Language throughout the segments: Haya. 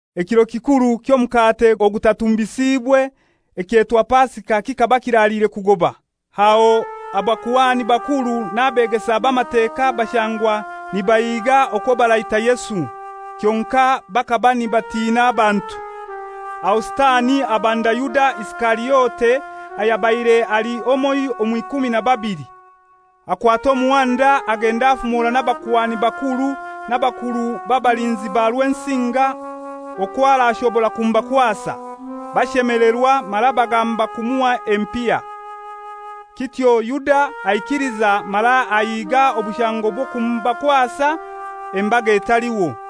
Ekiro kikuru ky'Omukate Ogutatumbisiibwe, ekyetwa Pasika kikaba kiraliire kugoba. Aho abakuhani bakuru n'abeegesa b'Amateka bashangwa nibahiga okwo baraita Yesu. Kyonkai bakaba nibatina abantu. Aho Sitani abanda Yuda Isikariote ayabaire ali omoiho omw'ikumi na babili. Akwata omuhanda agenda afumora n'abakuhani bakuru n'abakuru b'abalinzi ba Rwensinga okwo arashobora kumubakwasa. Bashemelerwa mara bagamba kumuha empiha. Kityo Yuda aikiliza mara ahiiga obushango bw'okumubakwasa embaga etaliho.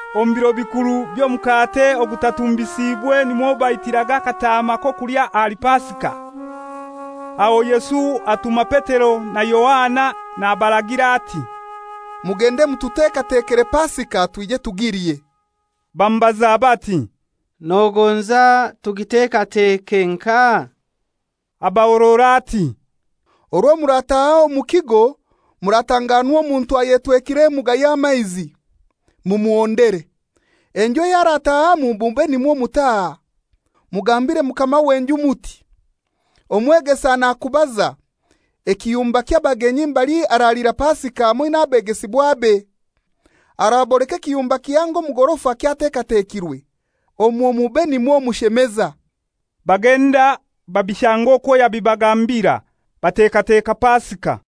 Omu biro bikuru by'Omukate Ogutatumbisiibwe nimwo baitiraga akataama k'okulya ahali Pasika. Aho Yesu atuma Petero na Yohana nabaragira ati, «Mugende mututekatekere Pasika twije tugilye.» Bamubaza bati, «Nogonza tugitekateke nkahai?» Abahorora ati, «Orwo murataha omu kigo muratanganwa omuntu ayetwekire emuga y'amaizi. Mumuhondere. Enju ey'aratahamu mube nimwo mutaha. Mugambire mukama w'enju muti, ‹Omwegesa nakuubaza ekiyumba ky'abagenyi mbali aralira Pasika hamoi n'abegesibwabe.› Araboleka ekiyumba kihango omu gorofa kyatekatekirwe, omwo mube nimwo mushemeza.» Bagenda babishanga okwo yabibagambira. Batekateka Pasika.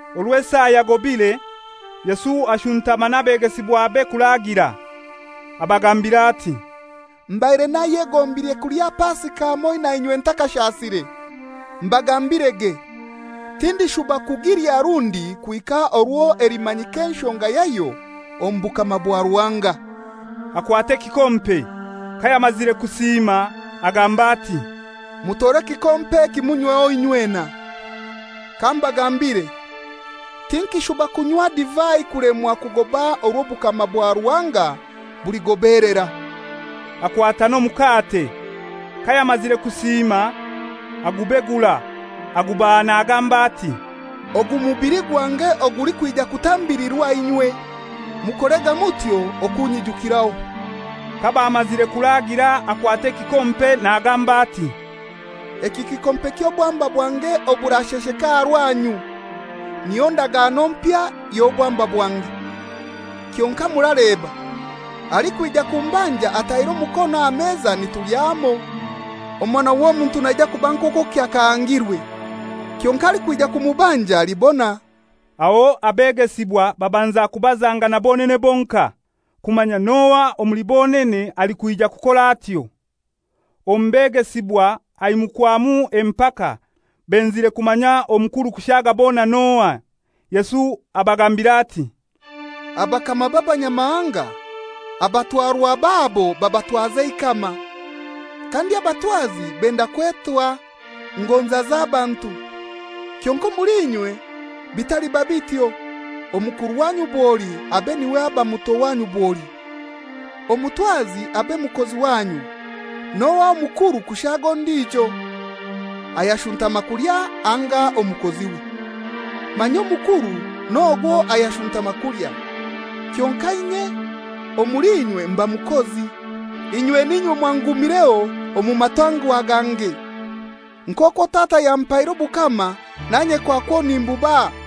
Orwo esaa yagobire, Yesu ashuntama n'abegesibwabe kuragira. Abagambira ati, «Mbaire nayegombire kulya Pasika hamoi nainywe ntakashasire. Mbagambirege, tindishuba kugilya rundi kuhika orwo elimanyika enshonga yayo omu Bukama bwa Ruhanga.» Akwata ekikompe. Kayamazire kusiima agamba ati, «Mutore ekikompe eki munyweho inywena. Kambagambire: Tinkishuba kunywa divai kulemwa kugoba orwo Obukama bwa Ruhanga buligobelera.» Akwata n'omukate. Kayamazire kusiima, agubegura, agubaha nagamba ati, «Ogu mubili gwange ogulikwija kutambilirwa inywe. [Mukorega mutyo okunyijukiraho.» Kabamazire kuragira akwata ekikompe nagamba ati, «Eki kikompe ky'obwamba bwange oburashesheka aha rwanyu, niyo ndagano empya y'obwamba bwange.] Kyonkai muraleba, alikwija kumbanja ataire omukono aha meza nitulya hamoi. Omwana w'Omuntu naija kuba nk'okwo kyakahangirwe. Kyonkai alikwija kumubanja alibona!» Aho abegesibwa babanza kubazangana bonene bonkai, kumanya n'ohai omuli bonene alikwija kukora atyo. Omu begesibwa haimukwamu empaka, benzire kumanya omukuru kushaaga bona n'ohai. Yesu abagambira ati, «Abakama b'abanyamahanga abatwarwa babo babatwaza eikama. Kandi abatwazi benda kwetwa ‹Ngonza z'abantu.› Kyonkai omuli inywe bitaliba bityo. Omukuru wanyu bwoli abe n'iwe aba muto wanyu bwoli. Omutwazi abe mukozi wanyu. N'ohai omukuru kushaaga ondijo: Ayashuntama kulya anga omukoziwe? Manya omukuru n'ogwo ayashuntama kulya. Kyonkai inye omuli inywe mba mukozi. «Inywe ninywe mwangumireho omu matangwa gange. Nk'okwo Tata yampaire obukama nanye kwakwo nimbubaha,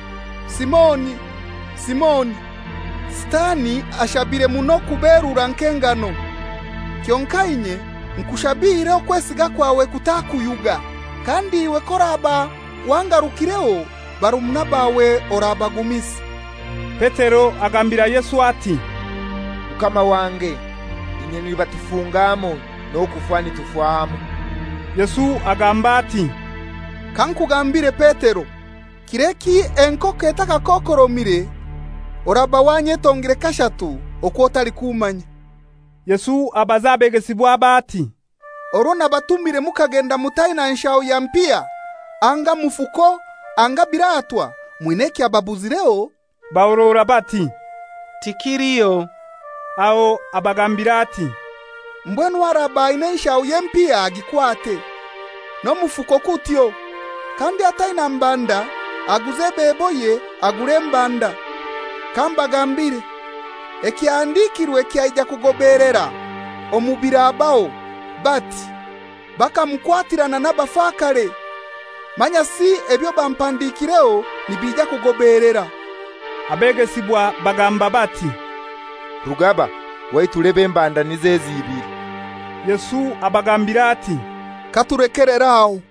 «Simoni, Simoni! Sitani ashabire muno kuberura nk'engano. Kyonkai inye nkushabiire okwesiga kwawe kutakuyuga. Kandi iwe k'oraba wangarukireho, barumuna bawe orabagumisa.» Petero agambira Yesu ati, «Mukama wange, inye nibatufunga hamoi, n'okufa nitufa hamoi.» Yesu agamba ati, «Kankugambire Petero, kir'eki enkoko etakakokoromire, oraba wanyetongire kashatu okw'otalikummanya.» Yesu abaza abegesibwabe ati, «Orwo nabatumire mukagenda mutaina nfulebe ya mpiha anga mufuko anga nbiratwa, mwina ekyababuzireho?» Bahorora bati, «Tikiliho.» Aho abagambira ati, «Mbwenu araba aina enfulebe y'empiha agikwate; n'omufuko kutyo. Kandi ataina mbanda aguze ebeboye agure embanda. Kambagambire, ekyahandikirwe kyaija kugobeelera omu birabaho, bati, ‹Bakamukwatirana n'abafakare.› Manyasi ebyo bampandikireho nibija kugobeelera.» Abegesibwa bagamba bati, «Rugaba, waitu leba embanda niz'ezi ibili.» Yesu abagambira ati, «Katulekelere aho.»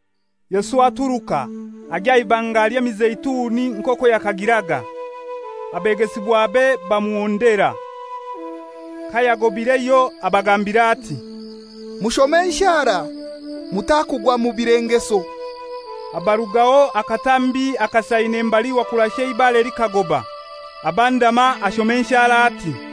Yesu aturuka, agya aha Ibanga ly'Emizeituni nk'okwo yakagiraga. Abegesibwabe bamuhondera. Kayagobireyo abagambira ati, «Mushome enshara, mutakugwa mu bilengeso.» Abarugaho akatambi akasaine mbali wakurasha eibare likagoba, abandama, ashoma enshara ati,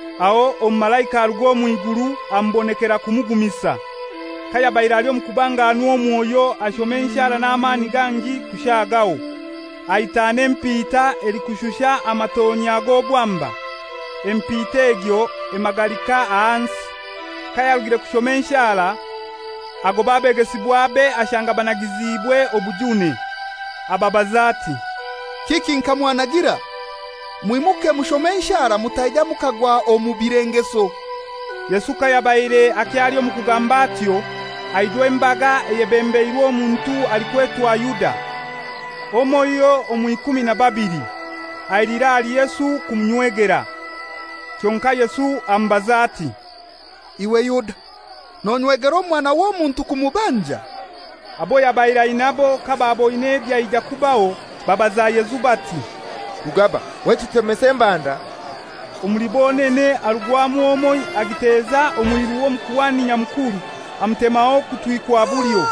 Aho omumalaika aruga omw'iguru amubonekera kumugumisa. Kayabaire ali omu kubanganwa omwoyo ashoma enshara n'amani gangi kushagaho. Ahitana empita elikushusha amatonya g'obwamba, empita egyo emagalika ahansi.] Kayarugire kushoma enshara, agoba abegesibwabe ashanga banagiziibwe obujune. Ababaza ati, «Kiki nka mwanagira? Mwimuke mushome enshara mutaija mukagwa omu bilengeso.» Yesu kayabaire akyali omu kugamba atyo, aijwa embaga eyebembeirwe omuntu alikwetwa Yuda, omoiho omw'ikumi na babili. Ailira ahali Yesu kumunywegera. Kyonkai Yesu amubaza ati, «Iwe Yuda, nonywegera Omwana w'Omuntu kumubanja?» Abo yabaire ainabo kabaaboine ebyaija kubaho, babaza Yesu bati, «Rugaba, waitu tutemese embanda?» Omuli bonene harugwamu omoi agiteza omwiru w'Omukuhani Nyamukuru amutemaho okutwi kwa bulyo.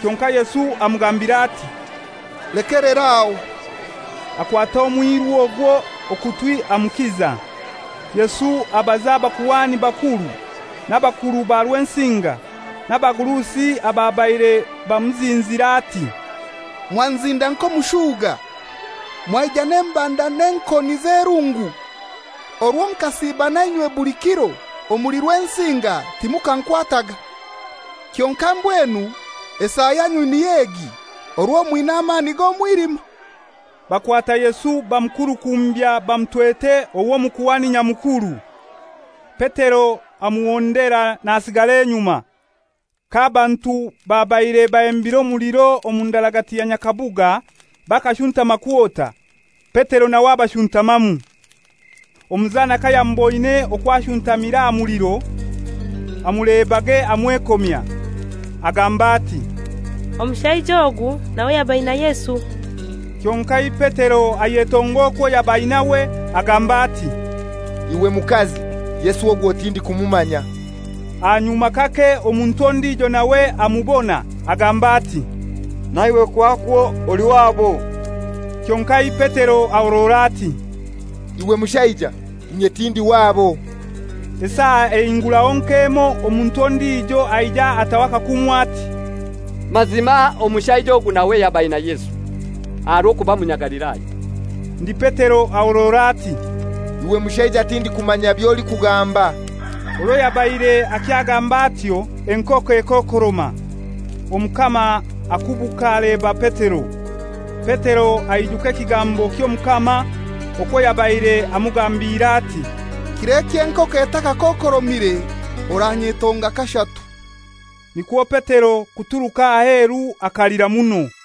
Kyonkai Yesu amugambira ati, «Lekelera aho!» Akwata omwiru ogwo okutwi amukiza. Yesu abaza abakuhani bakuru, n'abakuru ba Rwensinga, n'abagurusi ababaire bamuzinzire, ati, «Mwanzinda nk'omushuga, mwaija n'embanda n'enkoni z'erungu? Orwo nkasiiba nainywe buli kiro omuli Rwensinga timukankwataga. Kyonkai mbwenu esaa yanyu niy'egi orwo mwina amani g'omwilima.» Bakwata Yesu bamukurukumbya bamutwete ow'Omukuhani Nyamukuru. Petero amuhondera nasigara enyuma. K'abantu babaire bahembire omuliro omu ndaragati ya nyakabuga, bakashuntama kwota, Petero nawe abashuntamamu. Omuzana kayamuboine okwo ashuntamire aha muliro, amulebage amwekomya, agamba ati, «Omushaija ogu nawe yaba aina Yesu.» Kyonkai Petero ayetonga okwo yaba ainawe, agamba ati, «Iwe mukazi, Yesu ogwo tindikumumanya.» Ahanyuma kake omuntu ondijo nawe amubona, agamba ati, «Naiwe kwakwo oli wabo.» Kyonkai Petero ahorora ati, «Iwe mushaija, inye tindi wabo.» Esaa ehinguraho nk'emoi, omuntu ondijo aija ataho akakumu ati, «Mazima, omushaija ogu nawe yaba aina Yesu; aha rw'okuba Munyagalilaya.» Ndi Petero ahorora ati, «Iwe mushaija tindikumanya by'olikugamba.» Orwo yabaire akyagamba atyo, enkoko ekookoroma. Omukama akubuka aleba Petero. Petero aijuka ekigambo ky'Omukama, okwo yabaire amugambiire ati, «Kir'eki enkoko etakakokoromire, oranyetonga kashatu.» Nikwo Petero kuturuka aheru akalira muno.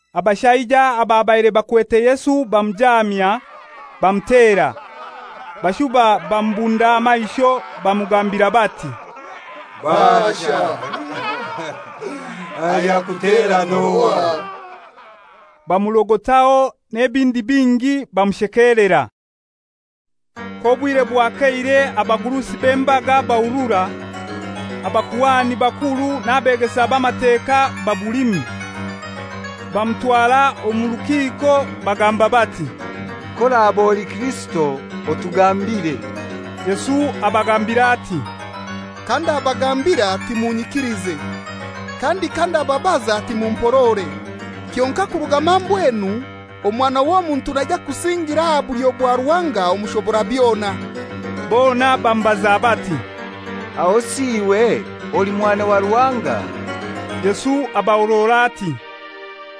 Abashaija ababaire bakwete Yesu bamujaamya, bamutera. Bashuba bamubunda aha maisho bamugambira bati, «Baasha! Ayakutera n'ohai?» Bamurogotaho n'ebindi bingi, bamushekelera. K'obwire bwakeire abagurusi b'embaga bahurura, abakuhani bakuru n'abeegesa b'Amateka babulimu. Bamutwara omu rukiko, bagamba bati, «K'oraba oli Kirisito otugambire.» Yesu abagambira ati, «Kandabagambira timunyikilize, kandi kandababaza timumporore. Kyonkai kuruga mambwenu Omwana w'Omuntu naija kusingira aha bulyo bwa Ruhanga Omushoborabyona.» Bona bamubaza bati, «Ahosi iwe oli mwana wa Ruhanga?» Yesu abahorora ati,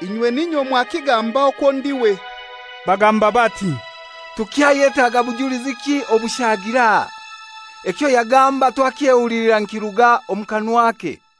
«Inywe n'inywe mwakigamba okwo ndiwe.» Bagamba bati, «Tukyayetaga bujuliziki obushagiire aha? Ekyo yagamba twakyehulilira nikiruga omu kanwake.»